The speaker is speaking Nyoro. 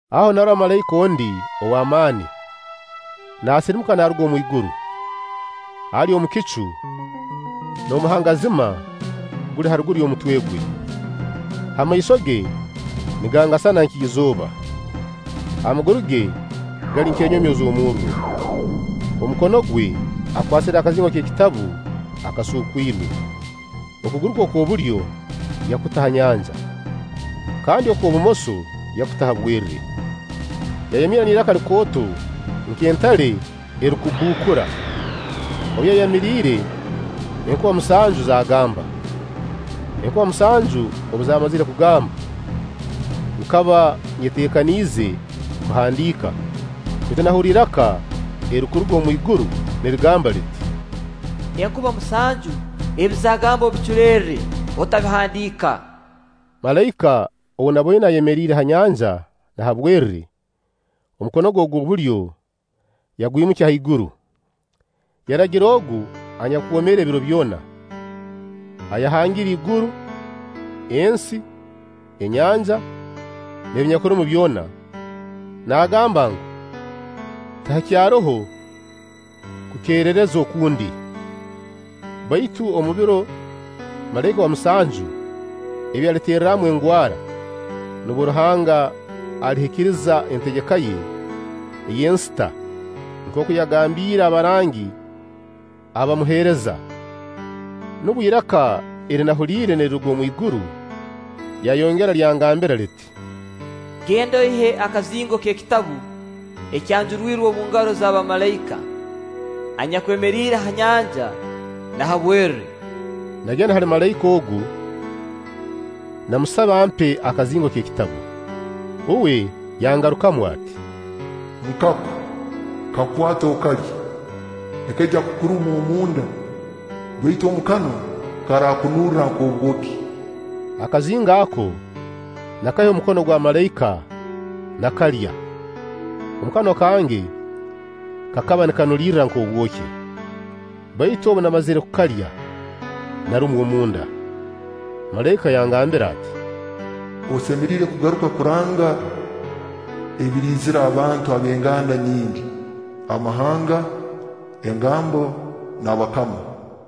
Aho narora malaika ondi ow'amaani naasirimuka naaruga omu iguru, ali omu kicu, n'omuhangazima guli haruguru y'omutwe gwe. Ha maiso ge nigangasana nk'izooba, amaguru ge gali nk'enyomyo z'omurro. Omu mukomo gwe akwasire akazingo k'ekitabu akasuukwirwe. Okuguru kwe okw'obulyo yakuta ha nyanja, kandi okw'obumoso yakuta ha bwerre. Yayamirra n'iraka likooto nk'entale erukubbuukura. Obu yayamiriire, enkuba musanju zaagamba. Enkuba omusanju obu zaamazire kugamba, nkaba nyeteekaniize kuhandiika, baitu nahurra iraka erirukuruga omwiguru nirigamba liti: “Enkuba musanju, ebi zaagamba obiculerre, otabihandiika.” Malaika ou naboine ayemeriire ha nyanja na ha bwerre, omukono gwe ogw'obulyo yagwimukya haiguru, yarahira Ogu anyakwomeera ebiro byona, ayahangire iguru, ensi, anyanja, n'ebinyakubirumu byona, naagamba ngu, tihakyaroho kukeerereza okundi, baitu omu biro malaika owa musanju ebi aliterramu engwara, nubwo Ruhanga alihikiriza entegeka ye ey'ensita nkooku yagambiire abarangi abamuheereza. Nubwo iraka eri nahuliire niriruga omwiguru, lyayongera lyangambira liti: “Genda oihe akazingo k'ekitabu ekyanjurwirwe omu ngaro za malaika anyakwemeriire ha nyanja na ha bwerre.” Nagenda hali malaika ogu, namusaba ampe akazingo k'ekitabu. Uwe yangarukamu ati: “Nkako, kakwate okalye; nikaija kukuruma omu nda, baitu omu kanwa karakunurra nk'obwoki.” Akazingo ako nakaiha omu mukono gwa malaika nakalya; omu kanwa kange kakaba nikanura nk'obwoki, baitu obu namazire kukalya, narumwa omu nda. Malaika yangambira ati: “Osemeriire kugaruka kuranga ebiriizira abantu ab'enganda nyingi, amahanga, engambo, n'abakama.”